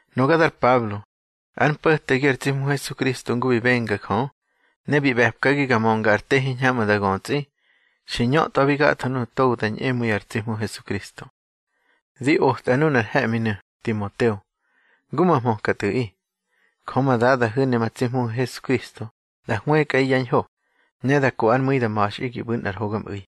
Nuga dar Pablo, ár mpo̱tegi ar tsi Hmu Hesukristo ngu bi benga Jö, ne bi ꞌbe̱pkagi ga mönga ar te hiñhamꞌu̱ da götsꞌi, xi ñötꞌwabi gatho nuꞌu̱ togo da ñꞌemu̱i ar tsi Hmu Hesukristo. Di otꞌa nunar he̱ꞌminu̱, Timoteo, ngu ma hmöka tꞌu̱ꞌi. Jö ma Dadahu̱ ne ma tsi Hmuhu̱ Hesukristo da hwëkꞌaꞌi yá ñho, ne da ko ár mu̱i da ma̱xꞌi gi ꞌbu̱ nꞌar hogamꞌu̱i.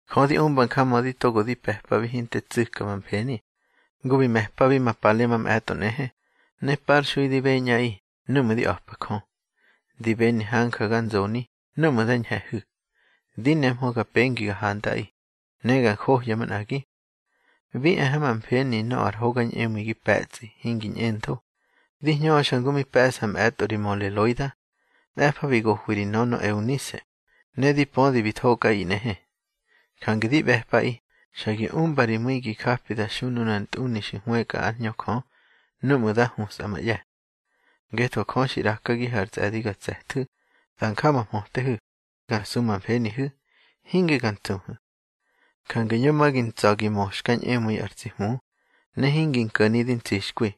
Jö di umba njamödi togo di pe̱pabi hinte tsu̱ka ma mfeni, ngu bi me̱pabi ma pale mamꞌe̱tꞌo nꞌehe, ne parxui di beñꞌaꞌi núꞌmu̱ di a̱pa Jö. Di beni hanja ga nzoni núꞌmu̱ nda ñhe̱hu̱, di nemhö ga pengi ga hantꞌaꞌi, ne ga njohya manꞌagi. Bi e ha ma mfeni nöꞌö ar hoga ñꞌemu̱i gi pe̱tsꞌi hingi ñꞌentho, di hñöxa ngu mi pe̱ꞌsa mꞌe̱tꞌo ri möle Loida. Mꞌe̱fa bi gohwi ri nönö Eunise, ne di pödi bi thokꞌaꞌi nꞌehe. Jange di ꞌbe̱pꞌaꞌi xa gi umba ri mu̱i gi japi da xu nunar ntꞌuni xi hwëkꞌa ár Hñö Jö núꞌmu̱ da husꞌa ma ꞌye̱. Ngetho Jö xi ꞌrakagihu̱ ar tsꞌe̱di ga tse̱thu̱, da nja ma mhötehu̱, ga su ma mfenihu̱, hinge ga ntsuhu̱. Jange yo ma gi ntsa̱ gi mö xka ñꞌemu̱i ar tsi Hmu, ne hingi nko̱ni di ntsixkwi,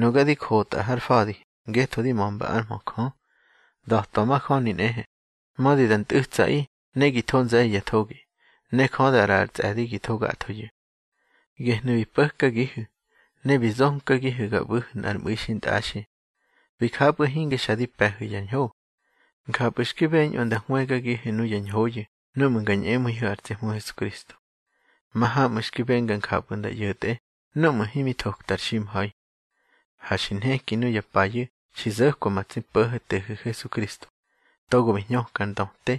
nuga di jotꞌa har fa̱di ngetho di mömba ár mhö Jö. Da̱twa majöni nꞌehe, mödi da ntꞌu̱tsaꞌi ne gi tho nze̱ye̱ ya thogi, ne Jö da ꞌraꞌa ar tsꞌe̱di gi tho gathoyu̱. Gehnu̱ bi po̱kagihu̱, ne bi zonkagihu̱ ga ꞌbu̱hu̱ nꞌar mꞌu̱i xintꞌaxi. Bi japꞌu̱ hinge xa di pe̱hu̱ ya ñho. Njapꞌu̱ xki beñꞌö nda hwëgagihu̱ nuya ñhoyu̱ nuꞌmu̱ nga ñꞌemu̱ihu̱ ar tsi Hmu Hesukristo. Mahamꞌu̱ xki benga njapꞌu̱ nda ꞌyo̱tꞌe núꞌmu̱ himi thokta ar ximha̱i. Ha xi nheki nuya payu̱ xi zo̱kwa ma tsi Po̱ho̱tehu̱ Hesukristo, togo bi hñöka ar ndöte,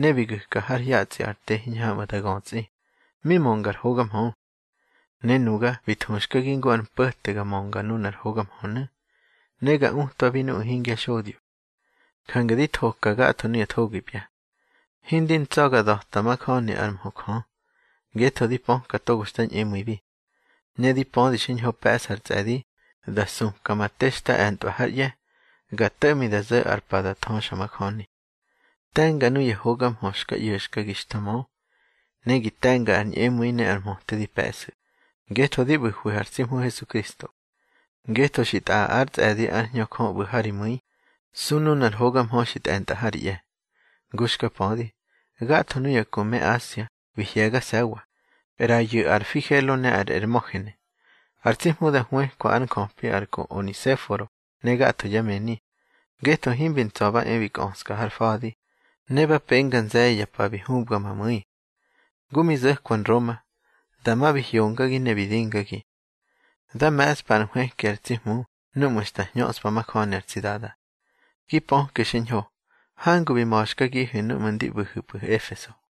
ne bi gu̱ka har hyatsꞌi ar te hiñhamꞌu̱ da götsꞌi, mi mönga ar hoga mhö. Ne nuga bi thuxkagi ngu ar mpo̱te ga mönga nunar hoga mhönu̱, ne ga utwabi nuꞌu̱ hingya xodyo. Jange di thoka gatho nuya thogipya. Hindi ntsa̱ ga da̱pa majöni ár mhö Jö, ngetho di pöka togo xta ñꞌemu̱ibi. Ne di pödi xiñho pe̱ꞌsa ar tsꞌe̱di da supka ma te xta e̱ntꞌwa hár ꞌye̱, ga to̱ꞌmi da zo̱ ar pa da thöxamajöni. Te̱nga nuya hoga mhö xka ꞌyo̱xkagi xta mö, ne gi te̱nga ar ñꞌemu̱i ne ar mhöte di pe̱ꞌsu̱, ngetho di ꞌbu̱hwihu̱ ar tsi Hmu Hesukristo. Ngetho xi tꞌaꞌa ár tsꞌe̱di ár Hñö Jö ꞌbu̱ ha ri mu̱i, su nunar hoga mhö xi tꞌe̱ntꞌa ha ri ꞌye̱. Ngu xka pödi, gatho nuya ku me Asia bi hye̱gase̱wa, ꞌrayu̱ ar Figelo ne ar Ermogene. Har tsi Hmu da hwëkwa ár njöpi ar ku Onesiforo ne gatho yá mëni, ngetho himbi ntsa̱ ba e bi kꞌöska har fa̱di, ne ba penga nze̱ye̱ ya pa bi hubga ma mu̱i. Ngu mi zo̱kwa Nroma, dama bi hyongagi ne bi dingagi. Dá me̱ꞌspa ar nhwëki ar tsi Hmu núꞌmu̱ xta hñöꞌspa majöni ar tsi Dada. Gi pöke xiñho hangu bi ma̱xkagihu̱ núꞌmu̱ ndi ꞌbu̱hu̱pꞌu̱ Efeso.